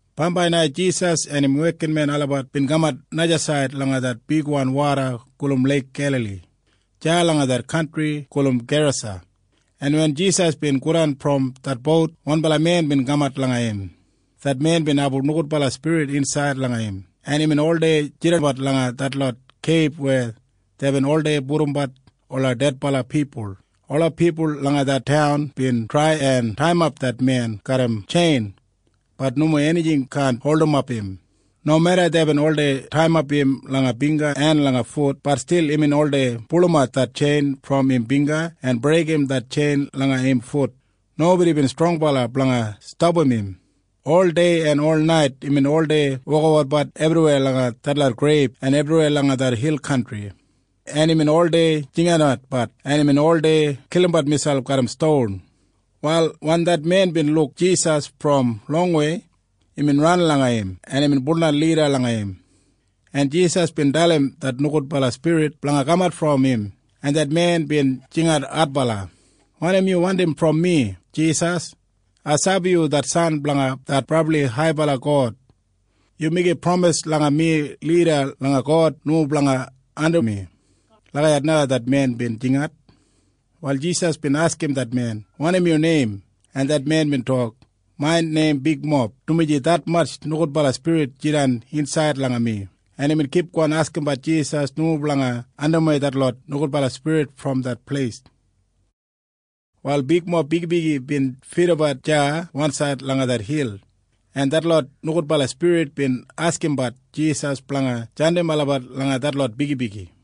Bambai na Jisas en im wekinmen olabat bin kamat najasaid langa det bigwan woda gulum Leik Gelali deya langa det kantri gulum Gerasa, en wen Jisas bin godan brom det bout, wanbala men bin kamat langa im. Det men bin abum nogudbala spirit insaid langa im, en imbin oldei jidanbat langa detlot keib weya deibin oldei pudumbat ola dedbala pipul. Ola pipul langa det taun bin trai en taiyimap det men garram tjein. Bat nomo enijing kaan holdimap im. Nomeda deibin oldei taiyimap im langa bingga en langa fut, bat stil imbin oldei pulumat det tjein brom im bingga en breigim det tjein langa im fut. Nobodi bin strongbala blanga stapam im. Oldei en olnait imbin oldei wokabat ebriweya langa detlot greib en ebriweya langa det hil kantri, en imbin oldei jinginatbat, en imbin oldei kilimbat miselp garram ston. Wal wen det men bin luk Jisas brom longwei, imbin ran langa im, en imbin nildan lida langa im, en Jisas bin dalim det nogudbala spirit blanga kamat brom im, en det men bin jingat adbala, “Wanim yu wandim brom mi, Jisas? Ai sabi yu det san blanga det brabli haibala God. Yu meigim pramis langa mi lida langa God nomo blanga ardim mi.” Lagijat na det men bin jingat. Wal Jisas bin askim det men, “Wanim yu neim?” En det men bin tok, “Main neim Bigmob, dumaji detmatj nogudbala spirit jidan insaid langa mi.” En imbin kipgon askimbat Jisas nomo blanga andimwei detlot nogudbala spirit brom det pleis. Wal bigmob bigibigi bin fidabat deya wansaid langa det hil, en detlot nogudbala spirit bin askimbat Jisas blanga jandim olabat langa detlot bigibigi.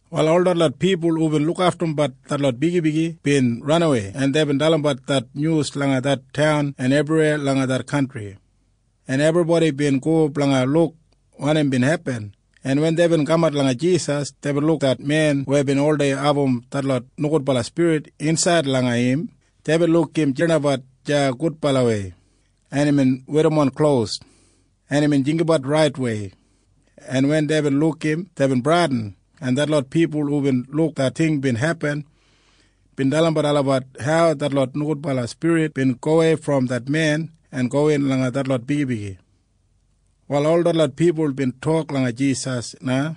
Wal ol detlot pipul hubin lukaftumbat detlot bigibigi bin ranawei, en deibin dalimbat det nyus langa det taun en ebriweya langa det kantri, en ebribodi bin go blanga luk wanim bin hepin, en wen deibin kamat langa Jisas, deibin luk det men weya bin oldei abum detlot nogudbala spirit insaid langa im. Deibin luk imbin jidanbat deya gudbalawei, en imbin werrimon klos, en imbin jinggabat raitwei. En wen deibin luk im, deibin bradin, en detlot pipul hubin luk det ting bin hepin bin dalimbat olabat hau detlot nogudbala spirit bin gowei brom det men en gowin langa detlot bigibigi. Wal ol detlot pipul bin tok langa Jisas na,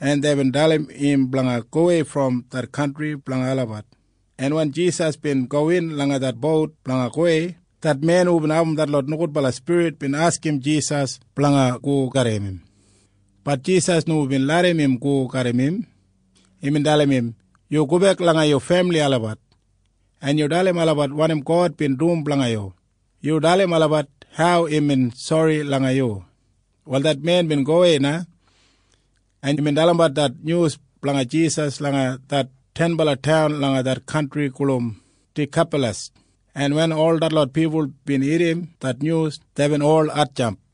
en deibin dalim im blanga gowei brom det kantri blanga olabat, en wen Jisas bin gowin langa det bout blanga gowei, det men hubin abum detlot nogudbala spirit bin askim Jisas blanga go garram im. Bat Jisas nomo bin larram im go garram im. Imbin dalim im, “Yu gobek langa yu femili olabat, en yu dalim olabat wanim God bin dum blanga yu. Yu dalim olabat hau imbin sori langa yu.” Wal det men bin gowei na, en imbin dalimbat det nyus blanga Jisas langa det tenbala taun langa det kantri gulum Dikapalas, en wen ol detlot pipul bin irrim det nyus, deibin ol hatjamp.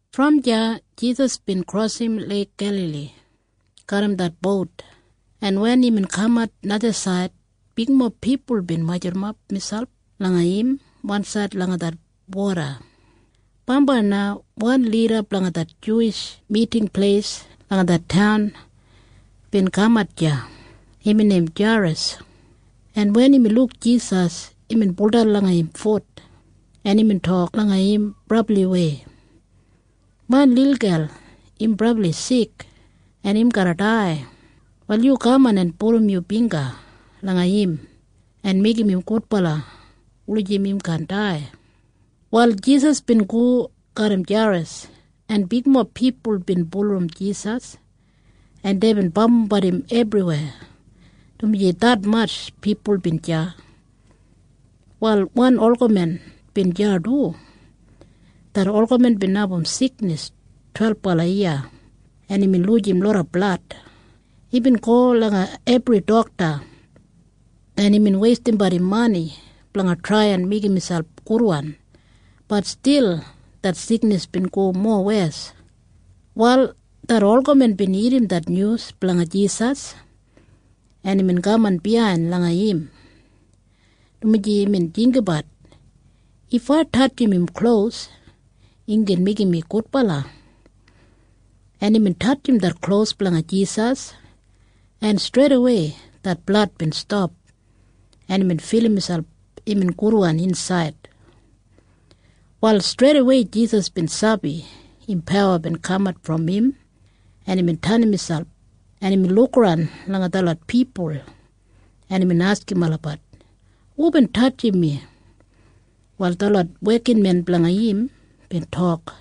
Brom deya Jisas bin krosim Leik Gelali garram det bout, en wen imbin kamat najasaid, bigmob pipul bin majurrumap miselp langa im wansaid langa det woda. Bambai na wan lida blanga det Miting Pleis blanga ola Juwish pipul langa det taun bin kaman deya. Imbin neim Jairas. En wen imbin luk Jisas, imbin baudan langa im fut, en imbin tok langa im brabliwei, “Main lilgel im brabli sik, en im garra dai. Wal yu kaman en pudum yu bingga langa im en meigim im gudbala wulijim im kaan dai.” Wal Jisas bin go garram Jairas, en bigmob pipul bin bulurrum Jisas, en deibin bambumbat im, dumaji detmatj pipul bin deya. Wal wan olgamen bin deya du. Det olgamen bin abum siknis twelbala yiya, en imbin lujim loda blad. Imbin go langa detmatj dokta, en imbin weistimbat im mani blanga trai en meigim miselp gudwan. Bat stil det siknis bin go mowes. Wal det olgamen bin irrim det nyus blanga Jisas, en imbin kaman biyain langa im, dumaji imbin jinggabat, “If ai tatjim im klos, im gin meigim mi gudbala.” En imbin tatjim det klos blanga Jisas, en streidawei det blad bin stap, en imbin filim miselp imbin gudwan insaid. Wal streidawei Jisas bin sabi pawa bin kamat brom im, en imbin tenim miselp, en imbin lukaran langa detlot pipul, en imbin askim olabat, “Hubin tatjim mi?” Wal detlot wekinmen blanga im bin tok,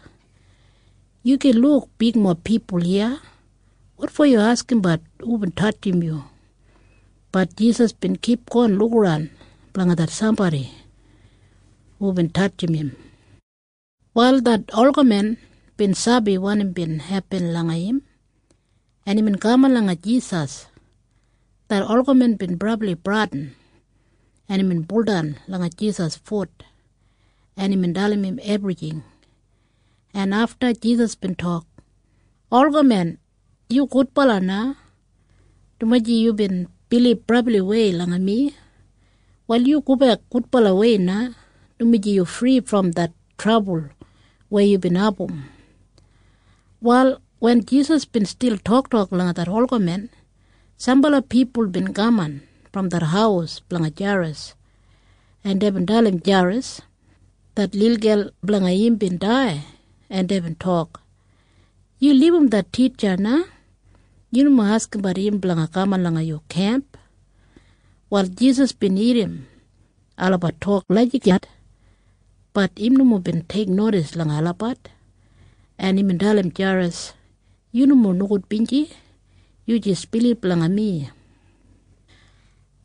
“Yu gin luk bigmob pipul iya. Wotfo yu askimbat hubin tatjim yu?” Bat Jisas bin kipgon lukaran blanga det sambodi hubin tatjim im. Wal det olgamen bin sabi wanim bin hepin langa im, en imbin kaman langa Jisas. Det olgamen bin brabli bradin, en imbin baudan langa Jisas fut, en imbin dalim im ebrijing, en afta Jisas bin tok, “Olgamen, yu gudbala na, dumaji yubin bilib brabliwei langa mi. Wal yu gobek gudbalawei na, dumaji yu fri brom det trabul weya yubin abum.” Wal wen Jisas bin stil toktok langa det olgamen, sambala pipul bin kaman brom det haus blanga Jairas, en deibin dalim Jairas det lilgel blanga im bin dai, en deibin tok, “Yu libum det titja na. Yu nomo askimbat im blanga kaman langa yu kemp.” Wal Jisas bin irrim olabat tok lagijat. Bat im nomo bin teiknodis langa olabat, en imbin dalim Jairas, “Yu nomo nogudbinji. Yu jis bilib langa mi.”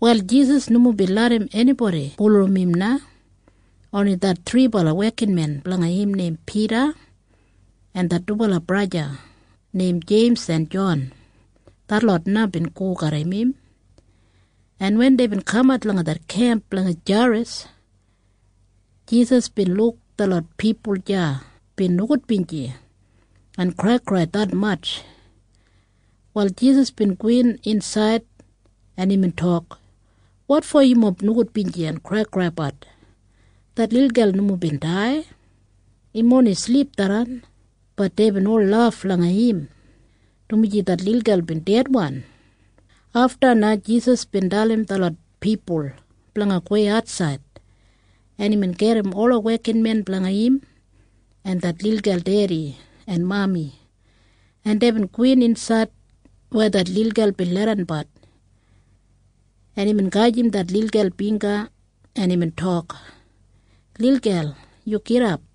Wal Jisas nomo bin larram enibodi bulurrum im na. Oni det thribala wekinmen blanga im neim Pida en det dubala braja neim Jeims en Jon, detlot na bin go garram im. En wen deibin kamat langa det kemp blanga Jairas, Jisas bin luk detlot pipul deya bin nogudbinji en kraikrai detmatj. Wal Jisas bin gowin insaid, en imbin tok, “Wotfo yumob nogudbinji en kraikraibat? Det lilgel nomo bin dai. Im oni silip tharran.” Bat deibin ol laf langa im, dumaji det lilgel bin dedwan. Afta na Jisas bin dalim detlot pipul blanga gowei atsaid, en imbin gedim ola wekinmen blanga im en det lilgel dedi en mami, en deibin gowin insaid weya det lilgel bin leidanbat, en imbin gajim det lilgel bingga, en imbin tok, “Lilgel, yu gidap!”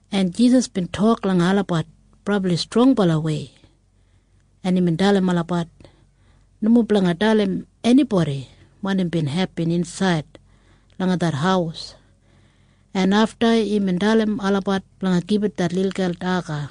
en Jisas bin tok langa olabat brabli strongbalawei, en imbin dalim olabat nomo blanga dalim enibodi wanim bin hepin insaid langa det haus. En afta imbin dalim olabat blanga gibit det lilgel daga.